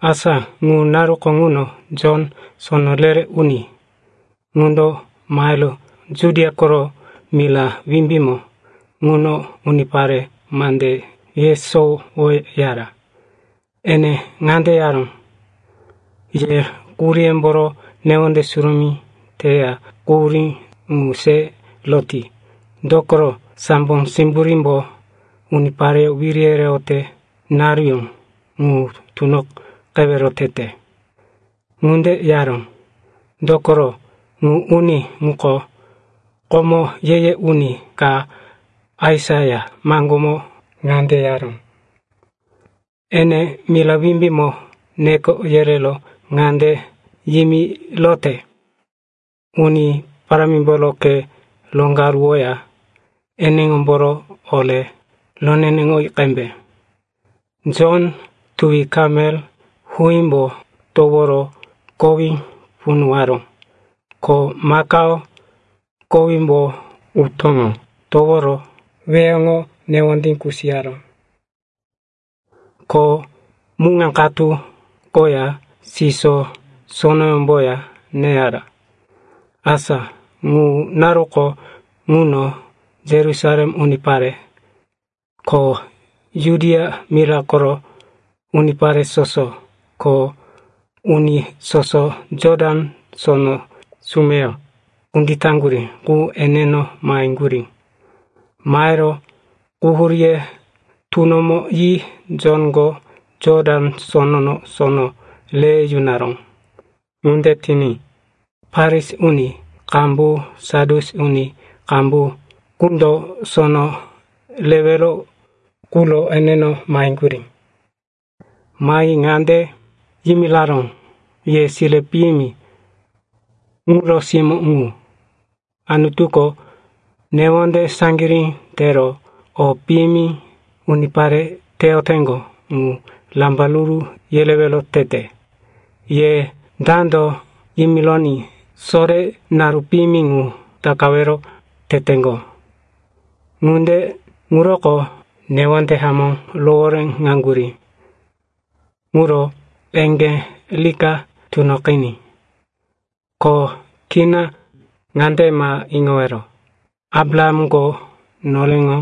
Asa ŋu naruko ŋuno Jon, sono re-re uni ŋundo mahero Judia koro Mira Wimbímo ŋuno unipare mande yesowoyara. Ene ŋande yaró, “Ye quhuríyemboro newonde surumí teya quhurí ŋu se roti. Dokoro sambo simburímbo unipareyó wiri yereyote naruyó ŋu tunoqewero tete.” Ŋunde yaró, dokoro ŋu uni ŋuko, komo ye-ye uni ka, Aisaia, maŋgómo ŋande yaró, “Enendo mira wimbímo neko yerero ŋande yimirote, ‘Uni Parámimboro khe roŋgaruwoya eneŋomboro ore roneneŋoyi qembe.’” Jonko tuwi kamel huímbo toworo kowí punuwaró. Ko makao kowímbo utóŋo toworo weheŋo newondí kusiyaró. Ko muŋa katu koya siso sonoyómboya neyara. Asa ŋu naruko ŋuno Yerusalem unipare, ko Judia mira koro unipare soso, ko uni soso Jotan Sono sumeyo kunditaŋgurí qu eneno maheŋgurí. Mahero quhuríye tunomo yi Jonko Jotan Sonono sono re yunaró. Ŋunde tiní Farisi uni qambu, Sadyusi uni qambu qundo sono rewero quro eneno maheyaŋgurí. Mahi ŋande yimiraró, “Ye sire piyimi ŋuro simó ŋu! Anutuko newonde saŋgirí tero o piyimi unipare teyoteŋgo ŋu rambaruru yerewero tete. Ye dando yimironí sore naru piyimi ŋu takawero teteŋgo? Ŋunde ŋuroko newonde hamó rohoréŋaŋgurí ŋuro eŋgé rika tunoqiní. Ko kina ŋande ma iŋowero, ‘Abrahamko noreŋo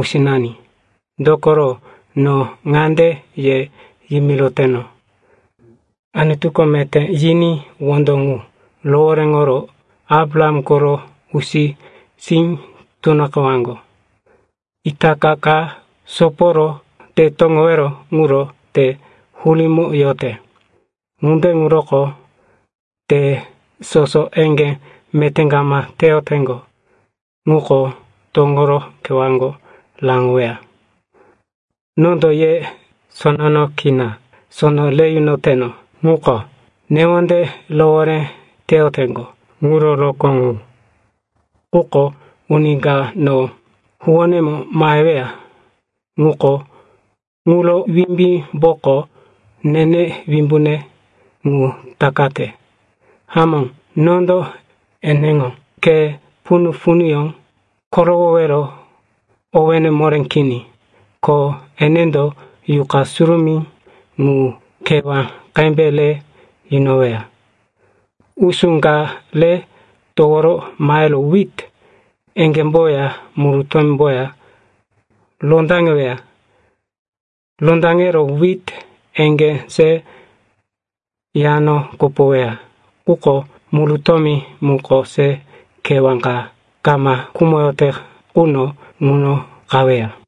usinani.’ Dokoro no ŋande ye yimiroteno, Anutuko meté yiní wondo ŋu rohoréŋoro Abraham koro usi-sí tunoqewaŋgo. Itaka ka soporo te toŋowero quro te hurímo yote. Ŋunde ŋuroko te soso eŋgé meté kama teyoteŋgo ŋuko toŋoro kewáko raŋoweya. “Nondo ye sonono kina sono re yunoyoteno ŋuko newonde rohoré teyoteŋgo ŋuro rokó ŋu. Quko uni ka no huwónemo maheweya ŋuko ŋuro wimbímboko nene wimbune ŋu takate. Hamó, nondo eneŋo khe punu-punuyó korowowero owéne moré kini. Ko enendo Yuqa Surumí ŋu kewá qembe re yunoweya. Usú ka re towo mahero wit eŋgémboya murutómboya rondaŋeweya. Rondaŋero wit eŋgé se yano kopoweya. Quko murutómi muko se kewá ka kama khumoyote quno ŋuno qaweya.”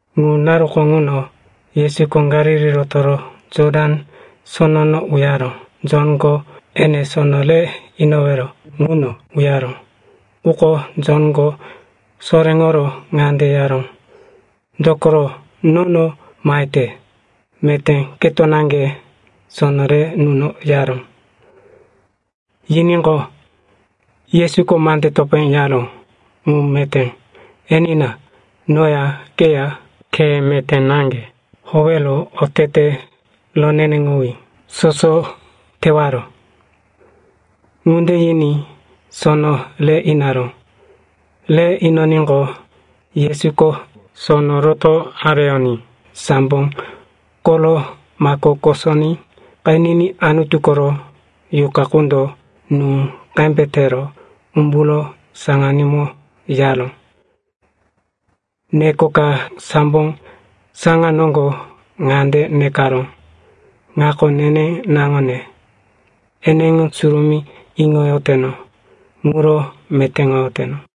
Ŋu naruko ŋuno Yesuko Galili rotoro Jotan Sonono uyaro Jonko ene sono re inowero ŋuno uyaró. Quko Jonko soréŋoro ŋande yaró, “Dokoro nono mahete? Meté keto naŋge sono re nuno,” yaró. Yiníqo, Yesuko mande topé yaró, “Ŋu meté, enina. Noya keya khe meté naŋge howero otete roneneŋowí soso tewaro.” Ŋunde yiní sono re inaró. Re inoníqo, Yesuko sono roto areyoní sambo koro mako kosoní qeniní Anutu koro Yuqa qundo nú qembe tero umburo saŋanímo yaró. Neko ka sambo saŋa noŋgo ŋande nekaró, “Ŋako neneŋo naŋone, eneŋo surumí iŋoyoteno. Ŋuro metéŋoyoteno.”